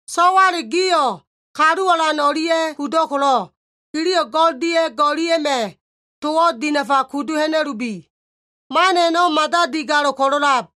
So꞉wale gio꞉ Kalu Alan o꞉lia꞉ kudo꞉ ko꞉lo꞉, giliyo꞉ go꞉l dia꞉ go꞉lia꞉ma꞉ towo꞉ dinafa kudu ha꞉na꞉lubi. Man a꞉no꞉ mada digalo꞉ ko꞉lo꞉lab.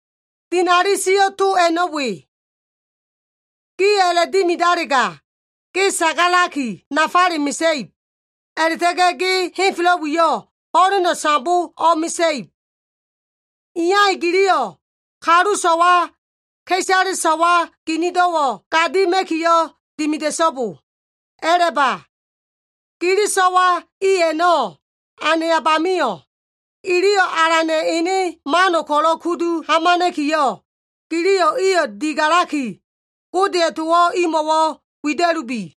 Dinali sio꞉ to a꞉no꞉ we. “Giyo꞉ a꞉la꞉dimidalega, ge sagalaki nafale mesa꞉ib, a꞉la꞉ta꞉ga꞉ ge henfelo꞉ wiyo꞉ ho꞉leno꞉ sambo o꞉mesa꞉ib.” Iya i giliyo꞉ kalu so꞉wa ka꞉isale so꞉wa ginido꞉wo꞉ gadima꞉kiyo꞉ dimida꞉so꞉bo. A꞉laba. Gili so꞉wa i a꞉no꞉ anayab amio꞉, iliyo꞉ Alana꞉ ene mano꞉ ko꞉lo꞉ kudu hamana꞉kiyo꞉, giliyo꞉ iyo꞉ digalaki, Godeya꞉ towo꞉ imo꞉wo꞉ wida꞉lubi.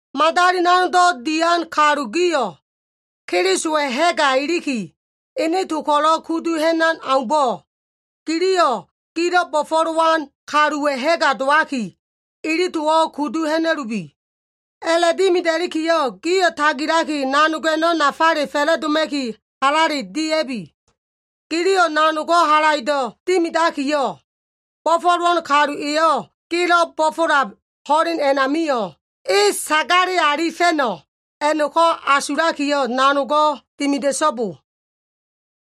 Madali nanogdo꞉ dian kalu gio꞉, Kelisowa꞉ ha꞉ga iliki, ene to ko꞉lo꞉ kudu ha꞉nan aumbo꞉, giliyo꞉ gilo꞉ bo꞉fo꞉lowan kaluwa꞉ ha꞉ga dowaki, ili towo꞉ kudu ha꞉na꞉lubi. A꞉la꞉dimida꞉likiyo꞉ gio꞉ tagilaki nanog a꞉no꞉ nafale fa꞉la꞉doma꞉ki halale dia꞉bi. Giliyo꞉ nanogo꞉ halaido꞉ dimidakiyo꞉, bo꞉fo꞉lowan kalu eyo꞉ gelo꞉ bo꞉fo꞉lab ho꞉len a꞉namio꞉, e sagale alifa꞉no꞉ a꞉no꞉ko꞉ asulakiyo꞉, nanogo꞉ dimida꞉so꞉bo.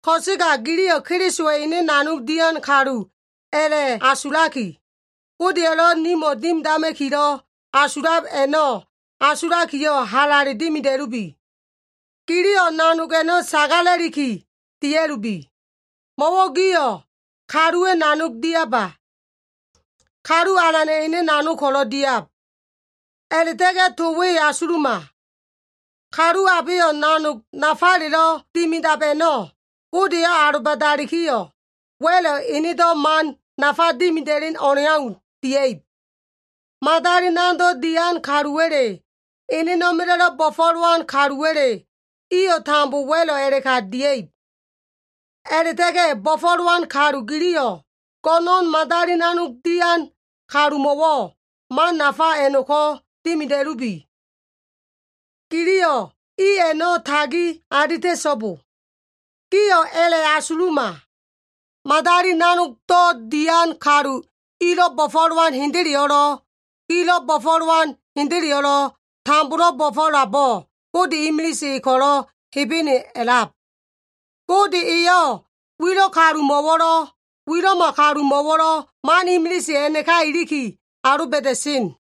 Ko꞉sega giliyo꞉ Kelisowa꞉ ene nanog dian kalu a꞉la꞉asulaki, Godeya꞉lo꞉ nimo꞉ dimidama꞉kilo꞉ asulab a꞉no꞉ asulakiyo꞉, halale dimida꞉lubi. Giliyo꞉ nanog a꞉no꞉ sagala꞉liki dia꞉lubi. Mo꞉wo꞉ gio꞉ kaluwa꞉ nanog diaba. Kalu Alana꞉ ene nanog ko꞉lo꞉ diab. A꞉la꞉ta꞉ga꞉ to we asuluma. Kalu abeyo꞉ nanog nafalelo꞉ dimidab a꞉no꞉, Gode eyo꞉ aloba꞉dalikiyo꞉ wa꞉lo꞉ enedo꞉ man nafa dimida꞉len o꞉leau dia꞉ib. Madali nanogdo꞉ dian kaluwa꞉le, enena꞉ma꞉la꞉lo꞉ bo꞉fo꞉lowan kaluwa꞉le, iyo꞉ tambo wa꞉lo꞉ a꞉la꞉ka dia꞉ib. A꞉la꞉ta꞉ga꞉ bo꞉fo꞉lowan kalu giliyo꞉, go꞉no꞉n madali nanog dian kalumo꞉wo꞉ man nafa a꞉no꞉ko꞉ dimida꞉lubi. Giliyo꞉ i a꞉no꞉ tagi alita꞉so꞉bo. Gio꞉ a꞉la꞉asuluma. Madali nanogdo꞉ dian kalu ilo꞉ bo꞉fo꞉lowan hendeleyo꞉lo꞉, gilo꞉ bo꞉fo꞉lowan hendeleyo꞉lo꞉, tambolo꞉ bo꞉fo꞉labo꞉ Gode imilise E ko꞉lo꞉ Hebene a꞉lab. Gode eyo꞉ wilo꞉ kalumo꞉wo꞉lo꞉, wilo꞉ma kalumo꞉wo꞉lo꞉ man imilise a꞉naka iliki aloba꞉da꞉sen.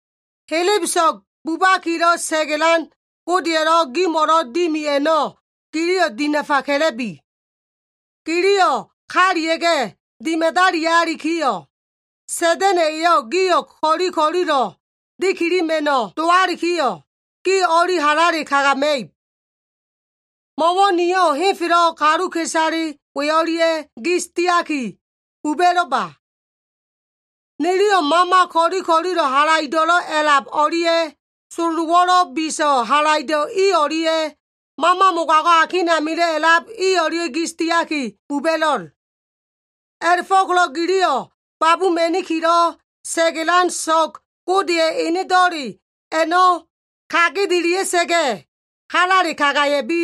Helebeso꞉g bubakilo꞉ sa꞉ga꞉lan Godeya꞉lo꞉ gimo꞉lo꞉ dimi a꞉no꞉ giliyo꞉ dinafa ka꞉la꞉bi. Giliyo꞉ kalia꞉ga꞉ dimadalialikiyo꞉, Sa꞉da꞉na꞉ eyo꞉ gio꞉ ko꞉li ko꞉lilo꞉ dikilima꞉no꞉ dowalikiyo꞉, gio꞉ o꞉li halale kagama꞉ib. Mo꞉wo꞉ nio꞉ henfelo꞉ kaluka꞉isale we o꞉lia꞉ gis diaki buba꞉lo꞉ba. Niliyo꞉ mama ko꞉li ko꞉lilo꞉ halaido꞉lo꞉ a꞉lab o꞉lia꞉, sololowo꞉lo꞉ biso꞉ halaido꞉ i o꞉lia꞉, mama mogago꞉ akin amilo꞉ a꞉lab o꞉lia꞉ gis diaki buba꞉lo꞉l. A꞉la꞉fo꞉ko꞉lo꞉ giliyo꞉ babuma꞉nikilo꞉ sa꞉ga꞉lan so꞉g Godeya꞉ enedo꞉le a꞉no꞉ kagedelia꞉sa꞉ga꞉ halale kagaya꞉bi.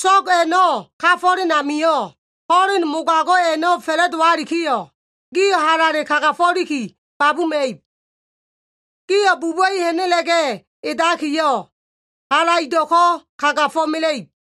So꞉g a꞉no꞉ kafo꞉len amio꞉, ho꞉len mogago꞉ a꞉no꞉ fa꞉la꞉dowalikiyo꞉, gio꞉ halale kagafo꞉liki babuma꞉ib. Gio꞉ buba꞉i ha꞉na꞉la꞉ga꞉ edakiyo꞉, halaido꞉ko꞉ kagafo꞉mela꞉ib.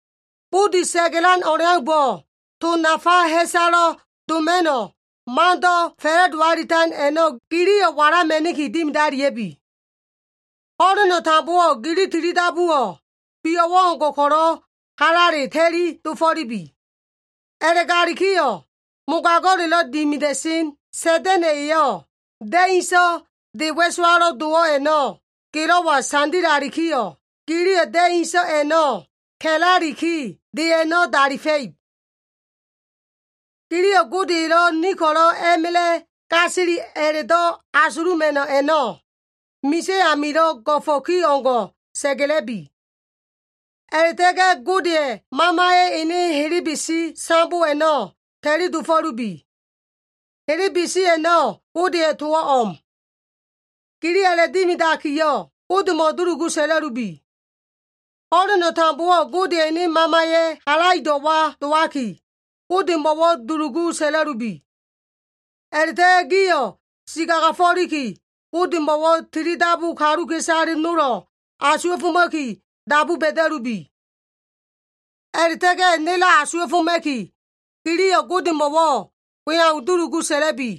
Budi sa꞉ga꞉lan o꞉leaumbo꞉, to nafa ha꞉salo꞉ doma꞉no꞉ mando꞉ fa꞉la꞉do alitan a꞉no꞉ giliyo꞉ walama꞉niki dimidalia꞉bi. Ho꞉leno꞉ tambowo꞉ gili tilidabuwo꞉, bio꞉wo꞉ o꞉ngo꞉ ko꞉lo꞉ halale ta꞉li dofo꞉lubi. A꞉la꞉galikiyo꞉, mogago꞉lelo꞉ dimida꞉sen Sa꞉da꞉na꞉ eyo꞉ da꞉ inso꞉ de wa꞉sowalo꞉ dowo꞉ a꞉no꞉ gelo꞉wa sandilalikiyo꞉, giliyo꞉ da꞉ inso꞉ a꞉no꞉ ka꞉laliki, de a꞉no꞉ dalifa꞉ib. Giliyo꞉ Gode elo꞉ ni ko꞉lo꞉ a꞉ma꞉la꞉ gasili a꞉la꞉do꞉ asuluma꞉no꞉ a꞉no꞉, misa꞉ amilo꞉ go꞉fo꞉ ki o꞉ngo꞉ sa꞉ga꞉la꞉bi. A꞉la꞉ta꞉ga꞉ Godeya꞉ Mamaya꞉ ene helebesi sambo a꞉no꞉ ta꞉li dofo꞉lubi. Helebesi a꞉no꞉ Godeya꞉ towo꞉ o꞉m. Giliyo꞉ a꞉la꞉dimidakiyo꞉, Godemo꞉ dulugu sa꞉la꞉lubi. Ho꞉leno꞉ tambowo꞉ Godeya꞉ ene Mamaya꞉ halaido꞉wa dowaki, Godemo꞉wo꞉ dulugu sa꞉la꞉lubi. A꞉la꞉ta꞉ga꞉ gio꞉ si kagafo꞉liki Godemo꞉wo꞉ tilidabu kaluka꞉isale nolo꞉ asuwa꞉foma꞉ki dabu ba꞉da꞉lubi. A꞉la꞉ta꞉ga꞉ nelo꞉ asuwa꞉foma꞉ki, giliyo꞉ Godemo꞉wo꞉ we au dulugu sa꞉la꞉bi.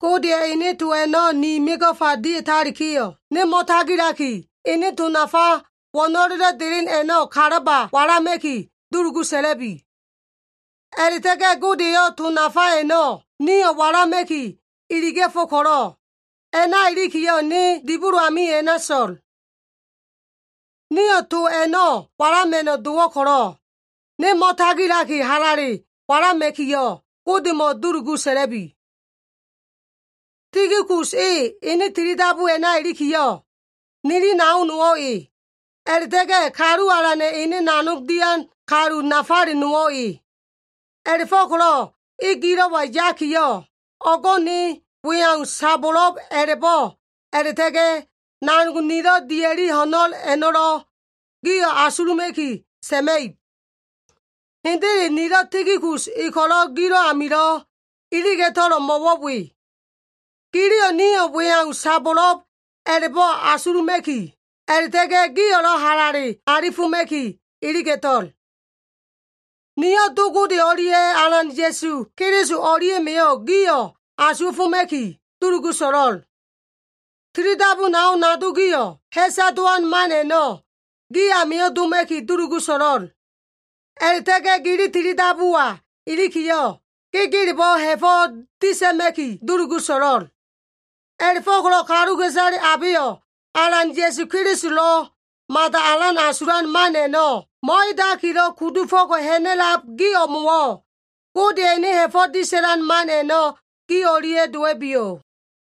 Godeya꞉ ene to a꞉no꞉ ni mego꞉fa dia꞉talikiyo꞉, ne mo꞉tagilaki, ene to nafa wo꞉no꞉lelo꞉ delen a꞉no꞉ kalaba walama꞉ki, dulugu sa꞉la꞉bi. A꞉la꞉ta꞉ga꞉ Gode eyo꞉ to nafa a꞉no꞉ niyo꞉ walama꞉ki iliga꞉fo꞉ ko꞉lo꞉, a꞉na ilikiyo꞉ ne dibolo amio꞉ a꞉na so꞉l. Niyo꞉ to a꞉no꞉ walama꞉no꞉ dowo꞉ ko꞉lo꞉, ne mo꞉tagilaki halale walama꞉kiyo꞉ Godemo꞉ dulugu sa꞉la꞉bi. Tikikus e ene tilidabu a꞉na ilikiyo꞉, nili nao nowo꞉ e, a꞉la꞉ta꞉ga꞉ Kalu Alana꞉ ene nanog dian kalu nafale nowo꞉ e. A꞉la꞉fo꞉ko꞉lo꞉ e gilo꞉wa yakiyo꞉, o꞉go꞉ ne we au sabo꞉lo꞉b a꞉la꞉bo꞉ a꞉la꞉ta꞉ga꞉, nanog nilo꞉ dia꞉li ho꞉no꞉l a꞉no꞉lo꞉ gio꞉ asuluma꞉ki sa꞉ma꞉ib. Hendele nilo꞉ Tikikus e ko꞉lo꞉ gilo꞉ amilo꞉ iliga꞉to꞉lo꞉ mo꞉wo꞉ we. Giliyo꞉ nio꞉ we au sabo꞉lo꞉b a꞉la꞉bo꞉ asuluma꞉ki, a꞉la꞉ta꞉ga꞉ gio꞉lo꞉ halale alifoma꞉ki iliga꞉to꞉l. Niyo꞉ Do Gode o꞉lia꞉ Alan Ya꞉su Keliso o꞉lia꞉ma꞉yo꞉ gio꞉ asuwa꞉foma꞉ki dulugu so꞉lo꞉l. Tilidabu nao nado gio꞉, ha꞉sa dowan man a꞉no꞉ gi amio꞉ doma꞉ki dulugu so꞉lo꞉l. A꞉la꞉ta꞉ga꞉ gili tilidabuwa ilikiyo꞉, gegelebo꞉ ha꞉fo꞉ disa꞉ma꞉ki dulugu so꞉lo꞉l. A꞉la꞉fo꞉ko꞉lo꞉ kaluka꞉isale abeyo꞉ Alan Ya꞉su Kelisolo꞉ mada alan asulan man a꞉no꞉ mo꞉edakilo꞉ kudufo꞉ko꞉ ha꞉na꞉lab gi o꞉mo꞉wo꞉, Godeya꞉ ene ha꞉fo꞉ disa꞉lan man a꞉no꞉ gi o꞉lia꞉ dowa꞉biyo꞉.